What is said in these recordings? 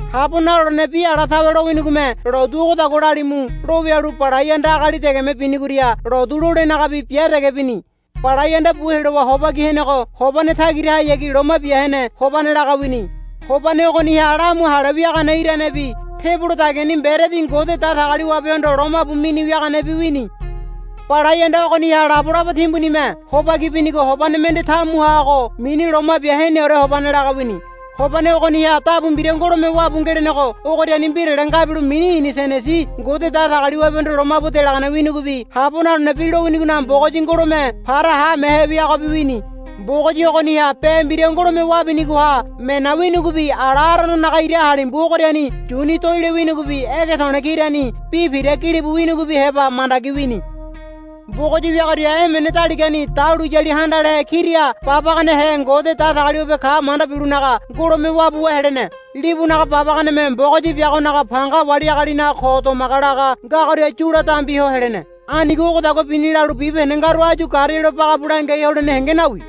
Habo nalolene bi ala tawe lowinigome, Lotu ogodagua lalimu, lo wialu Balai Anda agali degeme binigoria lotu lolenagabi bia dege bini. Balai Anda bu helowa hobaki henego hobane tagirahayagi Loma Bia Hene Hobane laga wini. Hobane ogoniha lamu hale wiagane iranebi tebolo dagiani mberedi Ngode Datagaliwabehondo lomabu mini wiaganebi wini. Balai Anda ogoniha labolabo timbunime hobaki binigo hobane mende tamuhago mini Loma Bia Heneore Hobane laga wini. Hobane ogoniha dabu mbira ngolome wabu ngelenego ogoriani mbirale ngabilo mini inisenesi Ngode Datagaliwabehondo lomabu delagane winigobi Habo Nalolene Bi lowinigonaga Mbogoyi ngolome para haamehe biagobi wini. Mbogoyi ogoniha be mbira ngolome wabinigoha mena winigobi ala Arononaga ira halimbu ogoriani yuni doaile winigobi ege to̱le̱ kirani bi pira gilibu winigobi heba mandagi wini. Mbogoyi wiagoria emene daligani dahuliyali handalehe kira babaganehe Ngode Datagaliwabe ka manda bilonaga ngolome wabuwa helene. Libunaga babaganeme Mbogoyi biagonaga panga wali agalinaga ko domaga laga ngagoria yula dambi ho helene. Anigo ogodagua bini lalu bibahende ngaru áyu garealo bagabu langiai holene henge nawi.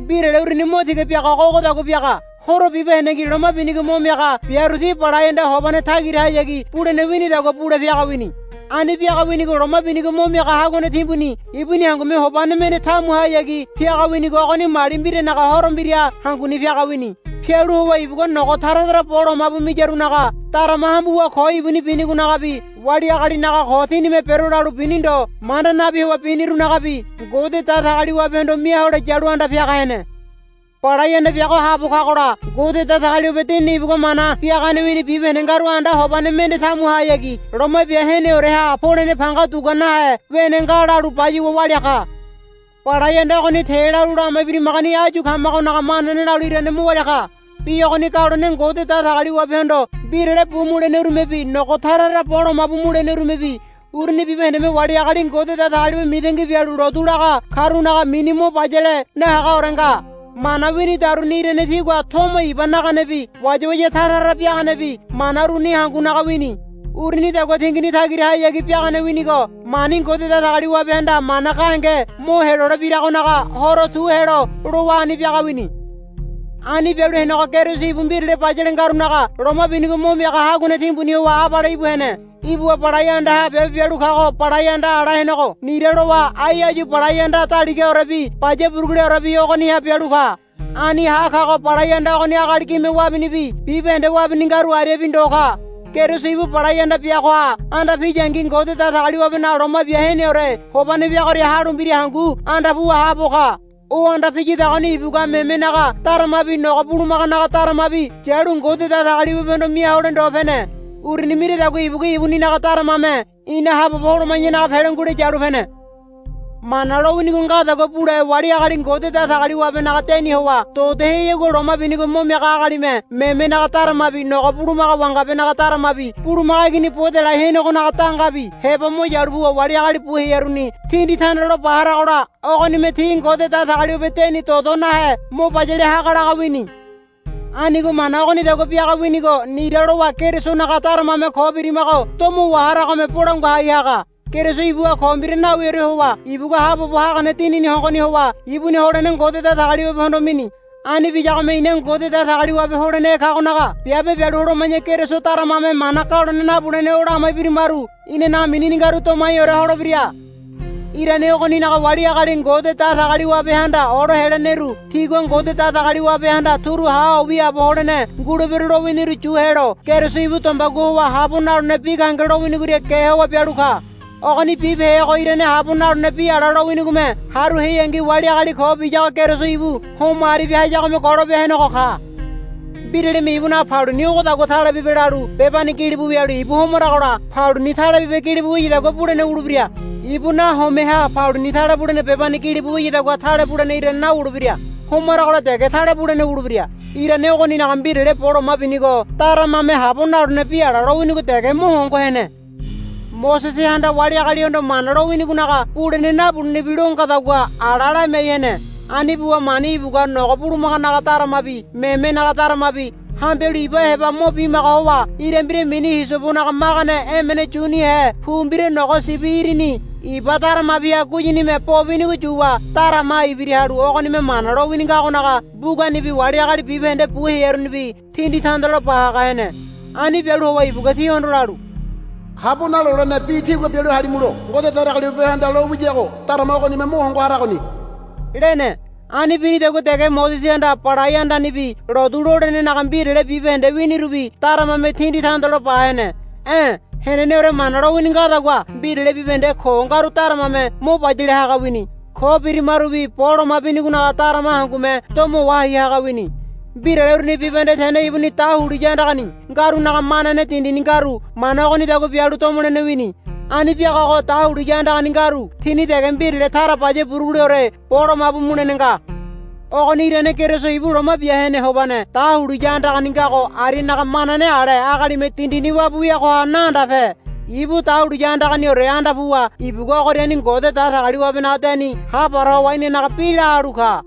Mbirale uruni mo tiga biagago ogodagua biaga. Horo bibahendengi loma binigo mo miaga biaru ti Balai Anda hobane tagirahayagi bulene winidagua bule piaga wini. Ani biaga winigo loma binigo mo miaga haguane timbuni ibuni hangume hobane mende tamuhayagi piaga winigo ogoni mali mbiranaga horo mbira hanguni piaga wini. Pialu howa ibugua nogo tara tara bo lomabu miyarunaga darama hambuwa ko ibuni binigonagabi wali agalinaga ko tinime bero lalu bini ndo manda nabi howa binirunagabi Ngode Datagaliwabehondo mia hole yalu anda piaga hene. Balai Anda biago haabo kagola Ngode Datagaliwabe Dinini ibugua mana biagane wini bibahende ngaru anda hobane mende tamuhayagi Loma Bia Heneoreha polene panga dugua nahe wene nga lalu bayuwa walia ka. Balai Anda ogoni te lalu lama ibirimagoni áyu kamagonaga manane lalu irane mo walia ka. Bi ogoni galone Ngode Datagaliwabehondo mbirale bu mulenerumebi nogo tara tara bo lomabu mulenerumebi uruni bibahendeme wali agali Ngode Datagaliwabe mitangi bialu lotu laga karunaga mini mo bayale nahagaore nga. Mana winidaruni irane tigua tomo iba naganebi wayawaya tara tara biaganebi mana uruni hangunaga wini. Urunidagua tingini tagirahayagi biagane winigo mani Ngode Datagaliwabehanda mana gahenge mo helolebiragonaga horo tu helo lowa ani biaga wini. Ani bialu henego Keriso ibu mbirale bayale ngarunaga Loma Binigo Mo Miaga Haguane Timbuni howa abale íbu hene. Ibuwa balai andaha biabe bialu kago balai anda ala henego nira lowa ai áyu balai anda daligaorebi baya buruguleorebi ogoniha bialu ka. Ani ha kago balai anda ogoni agali gime wabinibi bibahende wabini ngaru ariabi ndo ka. Keriso ibu balai anda biagoha anda piyangi Ngode Datagaliwabenaga Loma Bia Heneore Hobane wiagoria halu mbira hangu anda puwa haabo ka. O anda piyadagoni ibugua memenaga daramabi nogo bulumaganaga daramabi yalu Ngode Datagaliwabehondo mia hole ndo pene. Uruni miradagua ibugua ibuninaga daramame ina haabobo holoma̱yanaga pele ngule yalu pene. Mana lowinigo ngadagua bule wali agali Ngode Datagaliwabenaga deni howa dodoheyagua loma binigo mo miaga agalime memenaga daramabi nogo bulumaga wangabenaga daramabi bulumaga igini bo delai henegonaga dangabi heba mo yalu puwa wali agali bu hearuni tindi tandalo ba haragola ogonime ti Ngode Datagaliwabe deni dodo nahe mo bayale haga laga wini. Anigo mana ogonidagua biaga winigo nira lowa Kerisonaga daramame ko birimago domo waharagome bolangua hai haga. Keriso ibuha ko mbira nawiore howa ibugua haabobo hagane Dinini hongoni howa ibuni holene Ngode Datagaliwabehondo mini. Ani biyagome ina Ngode Datagaliwabe holenehe kagonaga biabe bialu holoma̱ya Keriso daramame mana galone nabulene o lama ibirimaru inanaga minini ngaru domaiore holebira. Irane ogoninaga wali agali Ngode Datagaliwabehanda olo heleneru tigua Ngode Datagaliwabehanda, Turu ha ho wiaabo holene ngulebero, lowiniru yu helo Keriso ibu dombegua howa habo nalolene bi gahenge lowinigoria ge howa bialu ka. Ogoni bibehego irane habo nalolene bi ala lowinigome haru heangi wali agali ko biyago Keriso ibu homo aribia hayagome golope henego ka. Mbiralime ibunaga paluni, Ogodagua tale bibe, lalu bebani gilibu wialu ibu homaragola paluni tale bibe gilibu wiyadagua bulene wulebira. Ibu nahomeha paluni tale bulene bebani gilibu wiyadagua tale bulene irane nawulebira. Homaragola dege tale bulene wulebira. Irane ogoninaga mbirale bo loma binigo daramame habo nalolene bi ala lowinigo dege mo hongo hene. Mosesehanda wali agalihondo Mana lowinigonaga bulene nabulenebi lo ngadagua ala lamiai hene. Ani buwa mani ibugua nogo bulumaganaga daramabi memenaga daramabi hambialu iba heba mo bimaga howa ira mbira mini hisobonaga magane emene yunihe pu mbira nogo sibi irini iba daramabiha guyinime bo binigo yuwa daramaha ibira halu ogonime Mana lowini ngagonaga mbuganibi wali agali bibahende bu hearunibi tindi tandalo ba haga hene. Ani bialu howa ibugua tihondo lalu, Habo nalolene bi tígua bialu halimulo Ngode Datagaliwabehanda lalu lowiyago darama ogonime mo hongo haragoni, lene. Ani binidagua dege Mosesehanda Balai Andanibi lotu lolenenaga mbirale bibahende wiarunibi daramame tindi tandalo ba hene. E̱ heneneore Mana lowini ngadagua mbirale bibahende ko ngaru daramame mo bayale haga wini. Ko birimarubi bo loma binigonaga darama hangume domo wahai haga wini. Mbirale uruni bibahende tene ibuni dahuliya andagani ngarunaga manane dindini ngaru mana ogonidagua bialu domolene wini. Ani biagago dahuliya andagani ngaru tini dege mbirale tara baya buruguleore bo lomabu mulene nga. Ogoni irane Keriso ibu Loma Bia Hene Hobane dahuliya andagani ngago arianaga manane ale agalime dindini wabu wiagoha naandape. Ibu dahuliya andaganiore anda puwa ibugua ogoriani Ngode Datagaliwabenaga deni hapara howa inanaga bi la halu ka.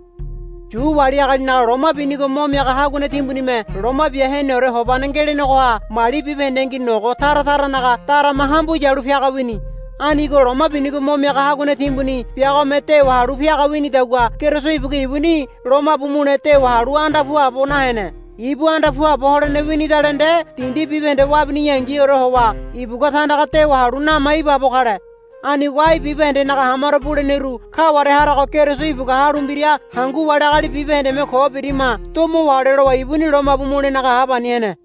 Yu wali agalinaga loma binigo mo miaga haguane timbunime Loma Bia Heneore Hobane ngelenegoha mali bibahendengi nogo tara taranaga darama hambu yalu piaga wini. Anigo loma binigo mo miaga haguane timbuni biagome dewa halu piaga winidagua Keriso ibugua ibuni lomabu mule dewa halu anda puabo nahene. Ibu anda puabo holene winidale nde dindi bibahende wabiyangiore howa ibugua tandaga dewa halu nama ibaabo kale. Anigo ai bibahendenaga hamaro buleneru kaware harago Keriso ibugua halu mbira hangu wali agali bibahendeme ko birima domo wahole lowa ibuni lomabu mulenaga hapani hene.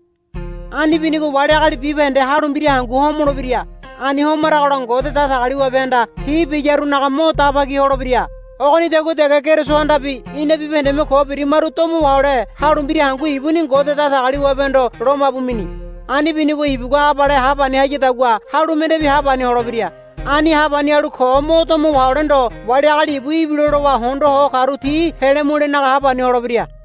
Ani binigo wali agali bibahende halu mbira hangu homolebira. Ani homaragola Ngode Datagaliwabehanda ti biyarunaga mo daba ki holebira. Ogonidagua dege Kerisohandabi ina bibahendeme ko birimaru domo wahole halu mbira hangu ibuni Ngode Datagaliwabehondo lomabu mini. Ani binigo ibugua abale hapani hayadagua halu mendebi hapani holebira. Ani hapani halu ko mo domo wahole ndo wali agali ibu ibilo lowa hondo ho karu ti pele mulenaga hapani holebira.